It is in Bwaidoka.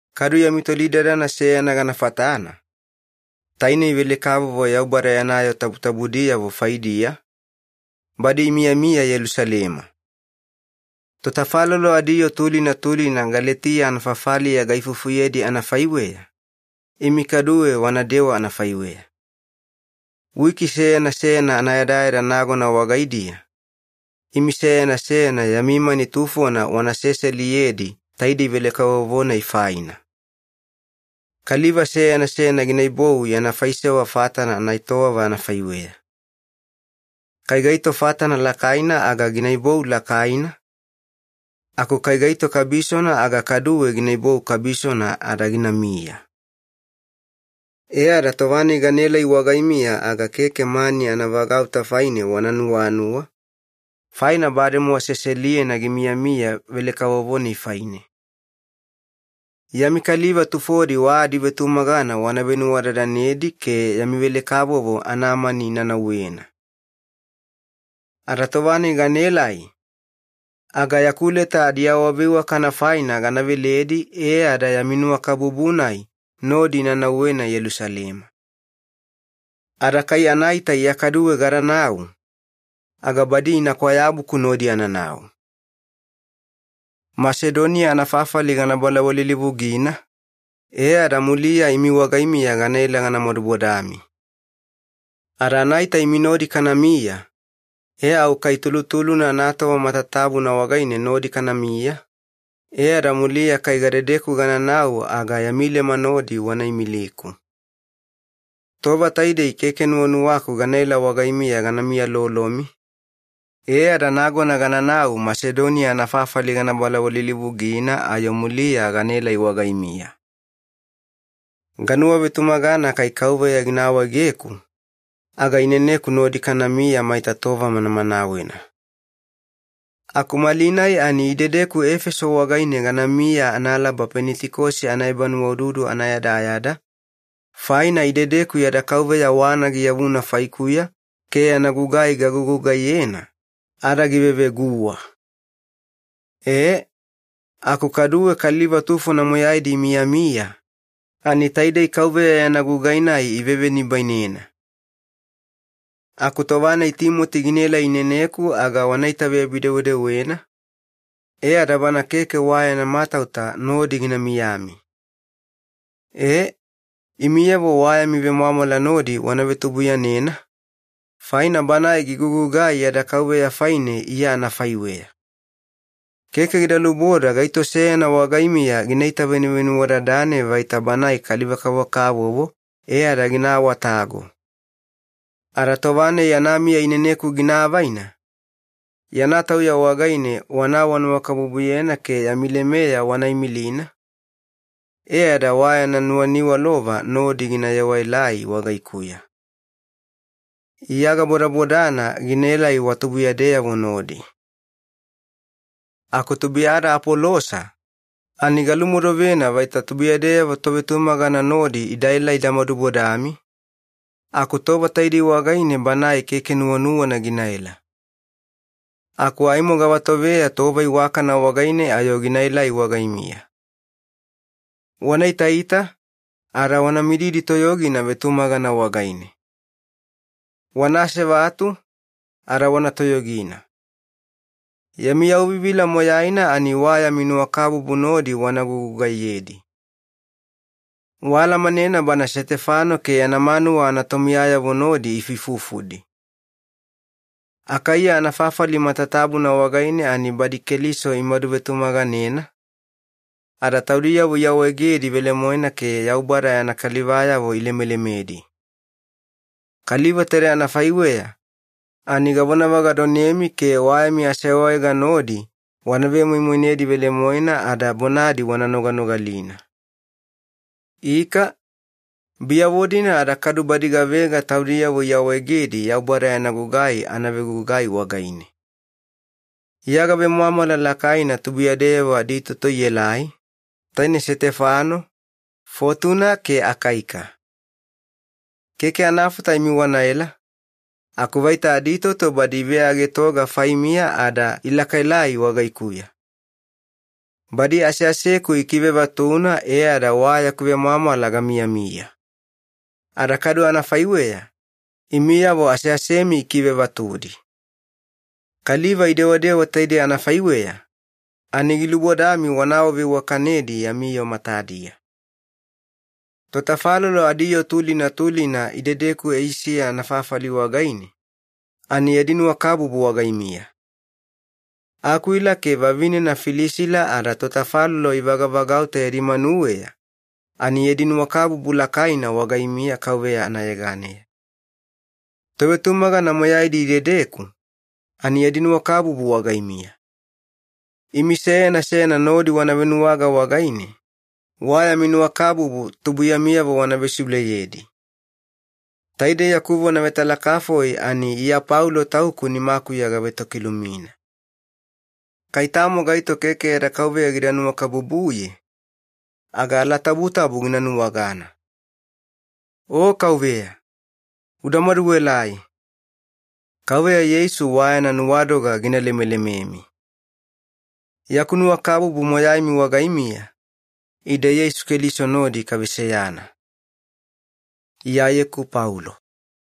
Kadu yami tolidadana seyana gana fatana, tainei velekavovo Yaubada yana yoo tabutabudiyavo faidiya, badi imiyamiya Yelusalema. Totafalolo adiyoo tulina tulina Galetiya anafafaliya gaifufuyedi anafaiweya, imi kaduwe wanadewa anafaiweya. Wiki seyana seyana anayadayada nagona wagaidiya, imi seyana seyana yami mani tufona wana seseliyedi taidei velekavovo-nai faina. Kaliva seyana seyana ginaibou yana faisewa fatana anaetowava anafaiweya. Kai gaito fatana lakaina aga ginaibou lakaina, aku kai gaito kabisona aga kaduwe ginaibou kabisona ada ginamiya. E ada tova-nai ganaelai wagaimiya aga keke mani anavagauta faine wana nuwanuwa, faina bademowa seseliyena gimiyamiya velekavovo-nai faine. Yami kaliva tufodi wa adivetumagana wana venuwadadanedi ke yami velekavovo anamani ina nauwena. Ada tova-nai ganaelai, aga yaku leta adiawaveiwakana faina gana veledi e ada yami nuwakabubu-nai nodi ina nauwena Yelusalema. Ada kai anaita Iya kaduwe gadanau, aga badi ina kwayabuku nodi ananau. Masedoniya anafafali gana balawalilivugina, e ada muliya imi wagaimiya ganaela gana madubodami. Ada anaita imi nodi kanamiya, e au kai tulutulu anatova matatabuna wagaine nodi kanamiya, e ada muliya kai gadedeku gananau aga yami lema nodi wana imiliku. Tova taidei keke nuwanuwaku ganaela wagaimiya gana miyalolomi, e ada nagona gananau Masedoniya anafafali gana balawalilivugina ayo muliya ganaelai wagaimiya. Ganuwavetumagana kai Kauveya gina awaegeku, aga ineneku nodi kanamiya maita tova manamanawena. Aku malinai ani idedeku Efeso wagaine ganamiya analaba Penitikosi anaebanuwaududu anayadayada, faina idedeku yada Kauveya wana giyavuna faikuya ke yana gugai gagugugaiyena, ada giveveguwa. E, aku kaduwe kaliva tufona moyaidi imiyamiya, ani taidei Kauveya yana gugai-nai ivevenibainena. Aku tova-nai Timoti ginaelai ineneku aga wana itaveyabi-dewedewena, e ada bana keke wa yana matauta nodi gina miyami. E, imiyavo wa yami vemwamwala nodi wana vetubuiyanena, faina banae gigugugai yada Kauveya faine Iya anafaiweya. Keke gida luboda gaito seyana wagaimiya gina itavenuvenuwadadane vaita banae kaliva-kavokavovo e ada gina awatago. Ada tova-nai yana miya ineneku gina avaina, yana tauya wagaine wana awanuwakabubuyena ke yami lemeya wana imilina, e ada wa yana nuwaniwalova nodi gina yewaelai wagaikuya. Iya gabodabodana ginaelai wa tubuiyadeyavo nodi. Aku tubuiyada Apolosa, ani galumodovena vaita tubuiyadeyavo tovetumagana nodi idaela ida madubodami, aku tova taidei wagaine banae keke nuwanuwana ginaela. Aku aimo gavatoveya tova iwakana wagaine ayo ginaelai wagaimiya. Wana itaita, ada wana mididi toyogina vetumagana wagaine. Wana asevatu, ada wana toyogina. Yami yauvivila moyaina ani wa yami nuwakabubu nodi wana gugugaiyedi. Waalamanena bana Setefano ke yana manuwa anatomiyayavo nodi ifuifufudi. Akaiya anafafali matatabuna wagaine ani badi Keliso imadu vetumaganena, ada taudiyavo iawaegedi velemoena ke Yaubada yana kalivayavo ilemelemedi. Kaliva taide anafaiweya, ani gavonavagadonemi ke wa yami aseawaega nodi wana vemoimoinedi velemoena ada bonadi wana noganogalina. Ika, biyavo-dina ada kadu badi gavega taudiyavo iawaegedi Yaubada yana gugai anavegugai wagaine. Iya gavemwamwala lakaina tubuiyadeyavo aditoto ielai, taine Setefano, Fotuna ke Akaika. Keke anafata imi wanaela, aku vaita aditoto badi iveagetoga faimiya ada ilakaelai wagaikuya. Badi aseaseku ikivevatuna e ada wa yaku vemwamwala gamiyamiya. Ada kadu anafaiweya, imiyavo aseasemi ikivevatudi. Kaliva idewadewa taidei anafaiweya, ani gilubodami wana awaveiwakanedi yami yoo matadiya. Totafalolo adiyoo tulina tulina idedeku Eisiya anafafali wagaine, ani yadi nuwakabubu wagaimiya. Akwila ke vavinena Filisila ada totafalolo ivagavagauta yadi manuweya, ani yadi nuwakabubu lakaina wagaimiya Kauveya anayeganeya. Tovetumagana moyaidi idedeku, ani yadi nuwakabubu wagaimiya. Imi seyana seyana nodi wana venuwaga wagaine, wa yami nuwakabubu tubuiyamiyavo wana vesiuleyedi. Taidei yaku vona vetalakafoi ani Iya Paulo tauku nimakuya gavetokilumina. Kai tamo gaito keke yada Kauveya gida nuwakabubuye, aga alatabutabu gina nuwagana. O Kauveya, uda maduelai! Kauveya Yeisu wa yana nuwadoga gina lemelememi. Yaku nuwakabubu moyaimi wagaimiya, ide Yeisu Keliso nodi kaveseyana. Iyayeku Paulo